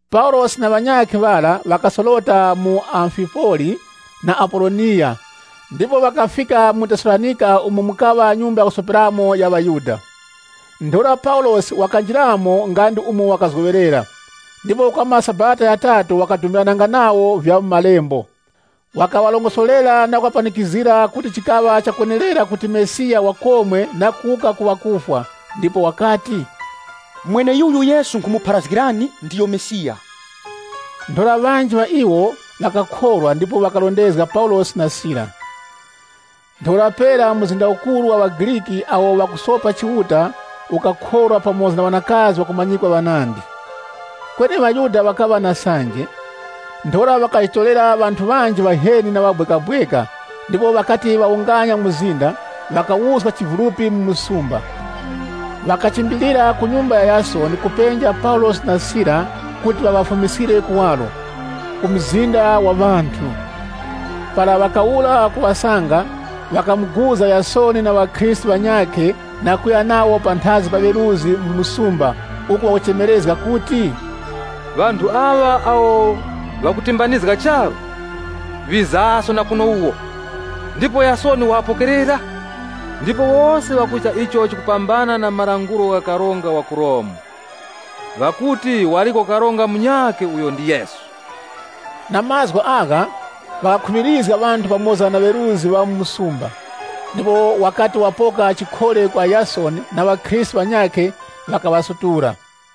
Paulosi na ŵanyakhe ŵara ŵakasorota mu Amfipoli na Apoloniya ndipo ŵakafika mu Tesalonika umo mukaŵa nyumba ya kusoperamo ya ŵaYuda. Ntheura Paulosi wakanjiramo nga ndi umo wakazgoŵerera, ndipo kwa maSabata ghatatu ŵakadumbirananga nawo vya mu Malembo. Wakaŵarongosorera na kuŵapanikizgira kuti chikaŵa chakwenerera kuti Mesiya wakomwe na kuwuka ku ŵakufwa. Ndipo wakati, “Mweneyuyu Yesu nkhumupharazgirani, ndiyo Mesiya.” Ntheura ŵanji ŵa iwo ŵakakhorwa ndipo ŵakarondezga Paulosi na Sila. Ntheura pera mzinda ukuru wa ŵaGriki awo ŵakusopa Chiuta ukakhorwa pamoza na ŵanakazi ŵakumanyikwa ŵanandi. Kweni ŵaYuda ŵakaŵa na sanje, ntheura ŵakajitorera ŵanthu ŵanji ŵaheni na ŵabwekabweka ndipo, ŵakati ŵawunganya mzinda, ŵakawuska chivulupi mu msumba. Ŵakachimbilira ku nyumba ya Yasoni kupenja Paulosi na Sila kuti ŵaŵafumiskire kuwaro, ku mzinda wa ŵanthu. Para ŵakawura kuŵasanga, ŵakamuguza Yasoni na ŵakhristu ŵanyakhe na kuya nawo panthazi pa ŵeruzgi mu msumba, uku ŵakuchemerezga kuti, “Ŵanthu aŵa awo ŵakutimbanizga charu, ŵizaso na kuno wuwo, ndipo Yasoni waŵapokerera. Ndipo wose ŵakuchita icho chikupambana na malangulo gha karonga wa ku Romu. Ŵakuti waliko karonga munyakhe uyo ndi Yesu.” Na mazgu agha ŵakakhuŵirizga ŵanthu pamoza na ŵeruzgi ŵa mu msumba. Ndipo wakati wapoka chikhole kwa Yasoni na ŵakhristu ŵanyakhe, ŵakaŵasutula.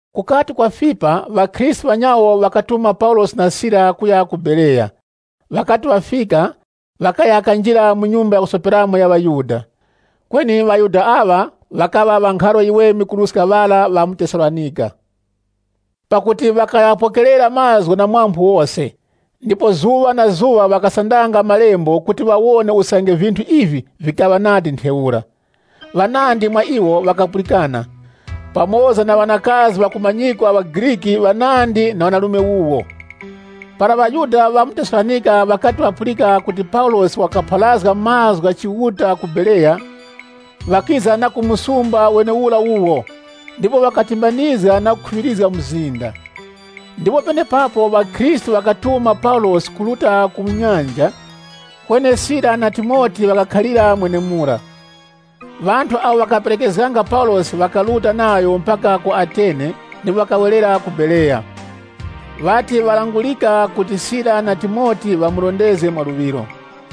Kukati kwafipa, ŵakhristu ŵanyawo ŵakatuma Paulosi na Sila kuya ku Bereya. Ŵakati ŵafika, ŵakaya kanjira mu nyumba ya kusoperamo ya ŵaYuda. Kweni ŵaYuda aŵa, ŵakaŵa ŵa nkharo yiweme kuruska ŵara ŵa mu Tesalonika, pakuti ŵakaghapokerera mazgu na phamphu lose. Ndipo zuŵa na zuŵa ŵakasandanga Malembo kuti wawone usange vinthu ivi vikaŵa nadi ntheura. Ŵanandi mwa iwo ŵakapulikana, pamoza na ŵanakazi ŵakumanyikwa ŵaGriki ŵanandi na ŵanarume wuwo. Para ŵaYuda ŵa mu Tesalonika ŵakati ŵakapulika kuti Paulosi wakapharazga mazgu gha Chiuta ku Bereya, ŵakiza na ku msumba wenewura wuwo, ndipo ŵakatimbanizga na kukhuŵirizga mzinda. Ndipo penepapo ŵakhristu ŵakatuma Paulosi kuruta ku nyanja, kweni Sila na Timote ŵakakhalira mwenemura. Ŵanthu awo ŵakaperekezganga Paulosi ŵakaruta nayo mpaka ku Ateni ndipo ŵakawerera ku Bereya, ŵati ŵalangurika kuti Sila na Timote ŵamurondezge mwa luŵiro.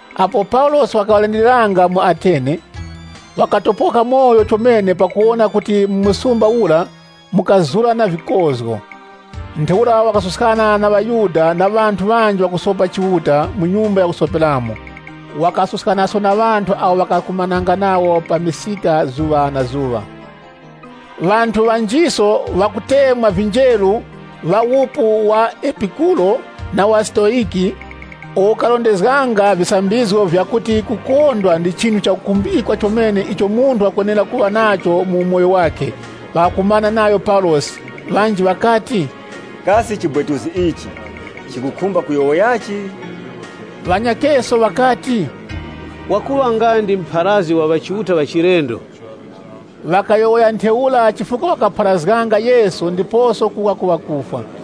Apo Paulosi wakaŵalindiriranga mu Ateni, wakatopoka umoyo chomene pakuwona kuti mu msumba ura mukazura na vikozgo. Ntheura wakasuskana na ŵaYuda na ŵanthu ŵanji ŵakusopa Chiuta mu nyumba ya kusoperamo. Wakasuskanaso na ŵanthu awo ŵakakumananga nawo pa misika zuŵa na zuŵa. Ŵanthu ŵanjiso ŵakutemwa vinjeru ŵa wupu wa Epikuro Epikuro: Ukaŵa mpingo wa ŵanthu uwo ukarondezganga visambizgo vyakuti kukondwa ndi chinthu chakukhumbikwa chomene icho munthu wakwenera kuŵa nacho mu umoyo wakhe. na wa Stoyiki, ŵakakumana nayo Paulosi. Ŵanji ŵakati, “Kasi chibwetuzi ichi chikukhumba kuyowoyachi?” Ŵanyakheso ŵakati, “Wakuŵa nga ndi mupharazgi wa ŵachiuta ŵachilendo.” Ŵakayowoya ntheura chifukwa wakapharazganga Yesu ndiposo kuwuka ku ŵakufwa.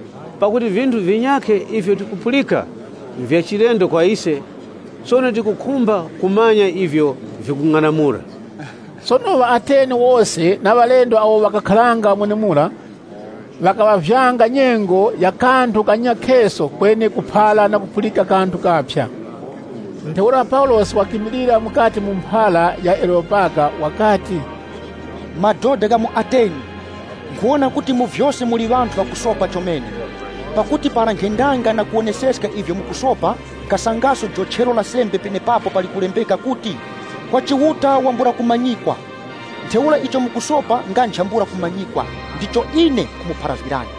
Pakuti vinthu vinyakhe ivyo tikupulika nvyachilendo kwa ise. Sono tikukhumba kumanya ivyo vikung'anamula.” Sono ŵaAteni wose na ŵalendo awo ŵakakharanga mwenemura, ŵakaŵavyanga nyengo ya kanthu kanyakheso kweni kuphara na kupulika kanthu kaphya. Ntheura Paulosi wakimilira mukati mu mphara ya Areyopaga, wakati, “Madoda gha mu Ateni, nkhuwona kuti mu vyose muli ŵanthu ŵakusopa chomene. Pakuti para nkhendanga na kuwoneseska ivyo mukusopa, nkhasangaso jochero la sembe penepapo pali kulembeka kuti, ‘KWA CHIUTA WAMBURA KUMANYIKWA.’ Ntheura icho mukusopa nga nchambula kumanyikwa, ndicho ine nkhumupharazgirani.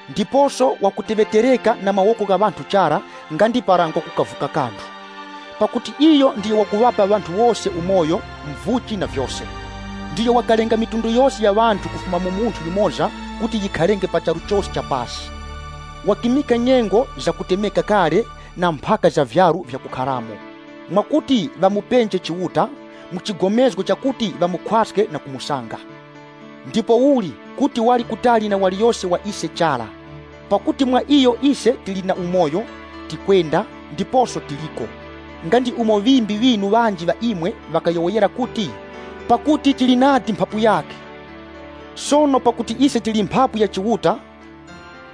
Ndiposo wakuteŵetereka na mawoko gha ŵanthu chara nga ndi para ngwa kukavuka kanthu. Pakuti iyo ndiyo wakuŵapa ŵanthu wose umoyo, muvuchi na vyose. Ndiyo wakalenga mafuko ghose kufuma mu munthu yumoza kuti ghakharenge pa charu chose cha pasi. Wakimika nyengo za kutemeka kale na mphaka za vyaru vyakukharamo, mwakuti ŵamupenje Chiuta, mu chigomezgo chakuti ŵamukhwaske na kumusanga. Ndipouli kuti wali kutali na waliyose wa ise chara. Pakuti, ‘Mwa iyo ise tili na umoyo, tikwenda, ndiposo tiliko.’ Nga ndi umo ŵimbi ŵinu ŵanji ŵa imwe, ŵakayowoyera kuti, ‘Pakuti tili nadi mphapu yakhe.’ Sono pakuti ise tili mphapu ya Chiuta,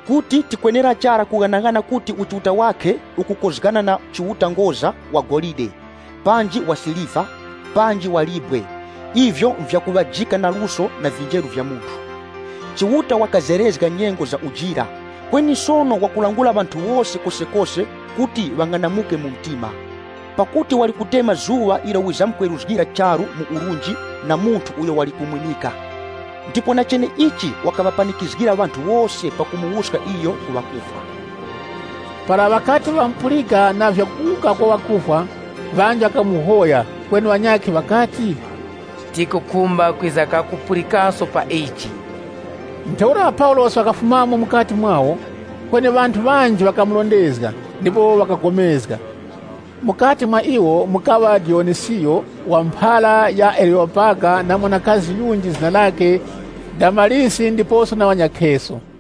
kuti tikwenera chara kughanaghana kuti Uchiuta wakhe ukukozgana na chiuta ngoza wa golide, panji wa siliva panji wa libwe, ivyo nvyakuŵajika na luso na vinjeru vya munthu. Chiuta wakazerezga nyengo za ujira, kweni sono wakulangula ŵanthu wose kosekose kuti ŵang'anamuke mu mtima. Pakuti wali kutema zuŵa ilo wizamkweruzgira charu mu urunji na munthu uyo wali kumwimika. Ndipo na cheneichi wakaŵapanikizgira ŵanthu wose pakumuwuska iyo ku ŵakufwa.” Para ŵakati ŵamupulika na vya kuwuka kwa ŵakufwa, ŵanji wakamuhoya, kweni ŵanyakhe ŵakati, “Tikukhumba kwiza kakupulikaso pa ichi.” Ntheura Paulosi wakafumamo mukati mwawo. Kweni ŵanthu ŵanji ŵakamurondezga, ndipo ŵakapulikana. Mukati mwa iwo mukaŵa Diyonisiyo wa mphara ya Areyopaga na mwanakazi yunji zina lakhe Damarisi ndiposo na ŵanyakheso.